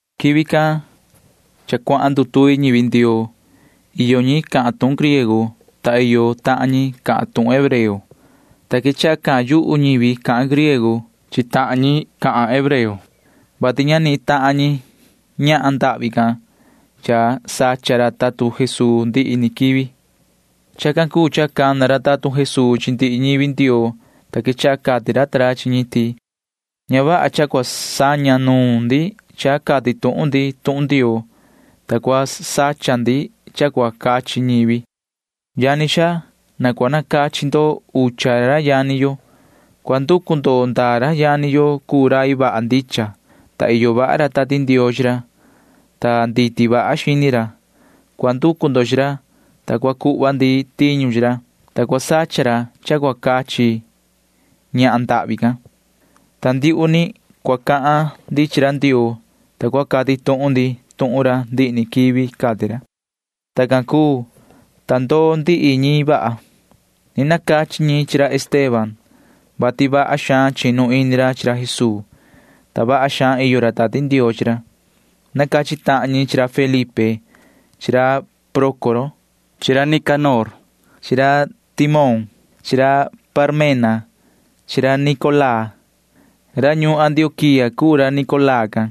Quivi can cha cuahan ndutuvi ñivi Ndioo. Iyo ñi cahan tuhun griego, ta iyo tahan ñi cahan tuhun hebreo, ta quechaha cahan yuhu ñivi cahan griego chi tahan ñi cahan hebreo, vati ña nihin tahan ñi ñahan ndahvi can cha sacha ra tatun Jesuu ndihi ni quivi. Chacan cuu cha cana ra tatun Jesuu chi ndihi ñivi Ndioo, ta quechaha cati ra ta ra chi ñi ti: ―Ña vaha cha cua saña nuun ndi cha cati tuhun ndi tuhun Ndioo, ta cua sacha ndi cha cua cachi ñivi. Yani xaa, na cua nacachi ndo ucha ra yani yo. Cua nducu ndo ndaa ra yani yo cuu rai vaha ndicha, ta iyo vaha ra Tati Ndioo chi ra, ta nditi vaha xini ra. Cua nducu ndo chi ra, ta cua cuhva ndi tiñu chi ra, ta cua sacha ra cha cua cachi ñahan ndahvi can. Ta ndiuhu ni cua cahan ndi chi ra Ndioo, ta cua cati tuhun ndi tuhun ra ndihi ni quivi ―cati ra. Tacan cuu, ta ndoo ndihi ñi vaha. Ni nacachi ñi chi ra Esteban, vati vaha xaan chinu ini ra chi ra Jesuu, ta vaha xaan iyo ra Tati Ndioo chi ra. Nacachi tahan ñi chi ra Felipe chi ra Prócoro chi ra Nicanor chi ra Timón chi ra Parmena chi ra Nicolaa. Ra ñuun Antioquía cuu ra Nicolaa can,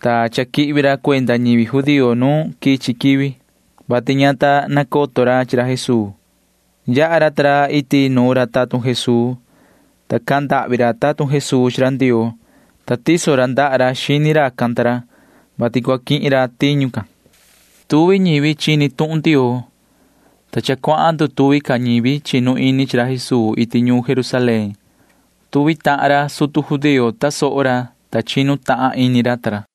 ta cha quihvi ra cuenda ñivi judío nu quichi quivi, vati ña ta nacoto ra chi ra Jesuu. Yaha ra ta ra iti nu ra tatun Jesuu, ta cahan ndahvi ra tatun Jesuu chi ra Ndioo, ta tiso ra ndaha ra xini racan ta ra, vati cua quihin ra tiñu can. Tuvi ñivi chini tuhun Ndioo, ta cha cuahan ndutuvi ca ñivi chinu ini chi ra Jesuu iti ñuun Jerusalén. Tuvi tahan ra sutu judío tasoho ra, ta chinu tahan ini ra ta ra.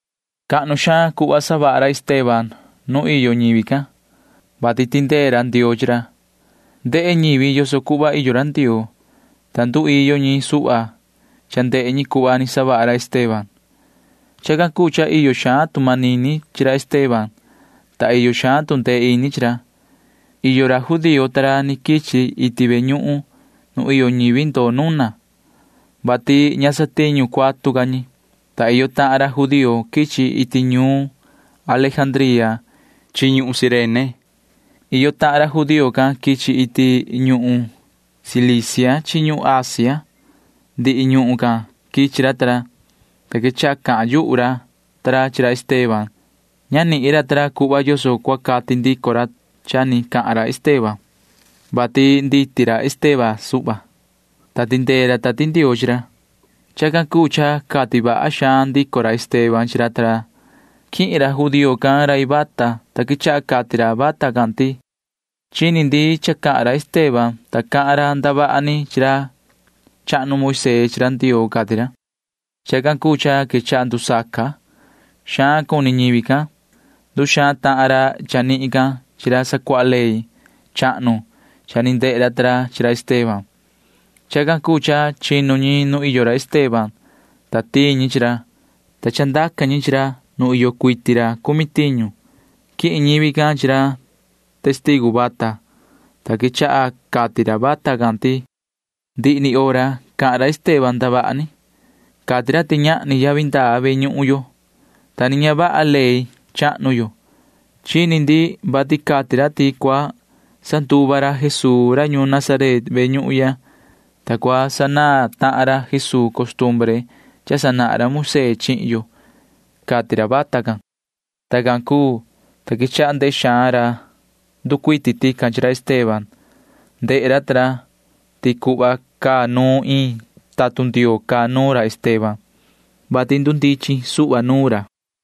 Cahnu xaan cuhva savaha ra Esteban nu iyo ñivi can, vati tindee ra Ndioo chi ra. Ndehe ñivi yoso cuhva iyo ra Ndioo, ta nduiyo ñi suhva cha ndehe ñi cuhva ni savaha ra Esteban. Chacan cuu cha iyo xaan tu manini chi ra Esteban, ta iyo xaan tu ndee ini chi ra. Iyo ra judío ta ra ni quichi iti ve ñuhun nu iyo ñivi ndoo nuna, vati ña satiñu cuatu ca ñi, ta iyo tahan ra judío quichi iti ñuun Alejandría chi ñuhun Cirene. Iyo tahan ra judío can quichi iti ñuhun Cilicia chi ñuhun Asia. Ndihi ñuhun can quichi ra ta ra, ta quechaha cahan yuhu ra ta ra chi ra Esteban. Ña nihin ra ta ra cuhva yoso cua cati ndico ra cha ni cahan ra Esteban, vati nditi ra Esteban suhva, ta tindee ra Tati Ndioo chi ra. Chacan cuu cha cati vaha xaan ndico ra Esteban chi ra ta ra. Quihin ra judío can rai vata, ta quechaha cati ra vata can ti: ―Chini ndi cha cahan ra Esteban, ta cahan ra ndavaha ni chi ra chahnu Moisee chi ra Ndioo ―cati ra. Chacan cuu cha quechaha ndusaca. Xaan cuni ñivi can. Nduxaan tahan ra chanihin can chi ra sacuaha ley chahnu cha ni ndehe ra ta ra chi ra Esteban. Chacan cuu cha chinu ñi nu iyo ra Esteban, ta tiin ñi chi ra, ta chandaca ñi chi ra nu iyo cuiti ra cumi tiñu. Quihin ñivi can chi ra testigu vata, ta quechaha cati ra vata can ti: ―Ndihi ni hora cahan ra Esteban ndavaha ni. Cati ra ti ñahni yavi ndaa ve ñuhun yo, ta ni ña vaha ley chahnu yo. Chini ndi vati cati ra ti cua sanduva ra Jesuu ra ñuun Nazaret ve ñuhun ya, ta cua sanaan tahan ra Jesuu costumbre cha sanahan ra Moisee chihin yo ―cati ra vata can. Tacan cuu, ta quechaha ndehe xaan ra nducuiti tican chi ra Esteban. Ndehe ra ta ra ti cuhva caa nuun iin tatun Ndioo caa nuun ra Esteban, vati ndundichin suhva nuun ra.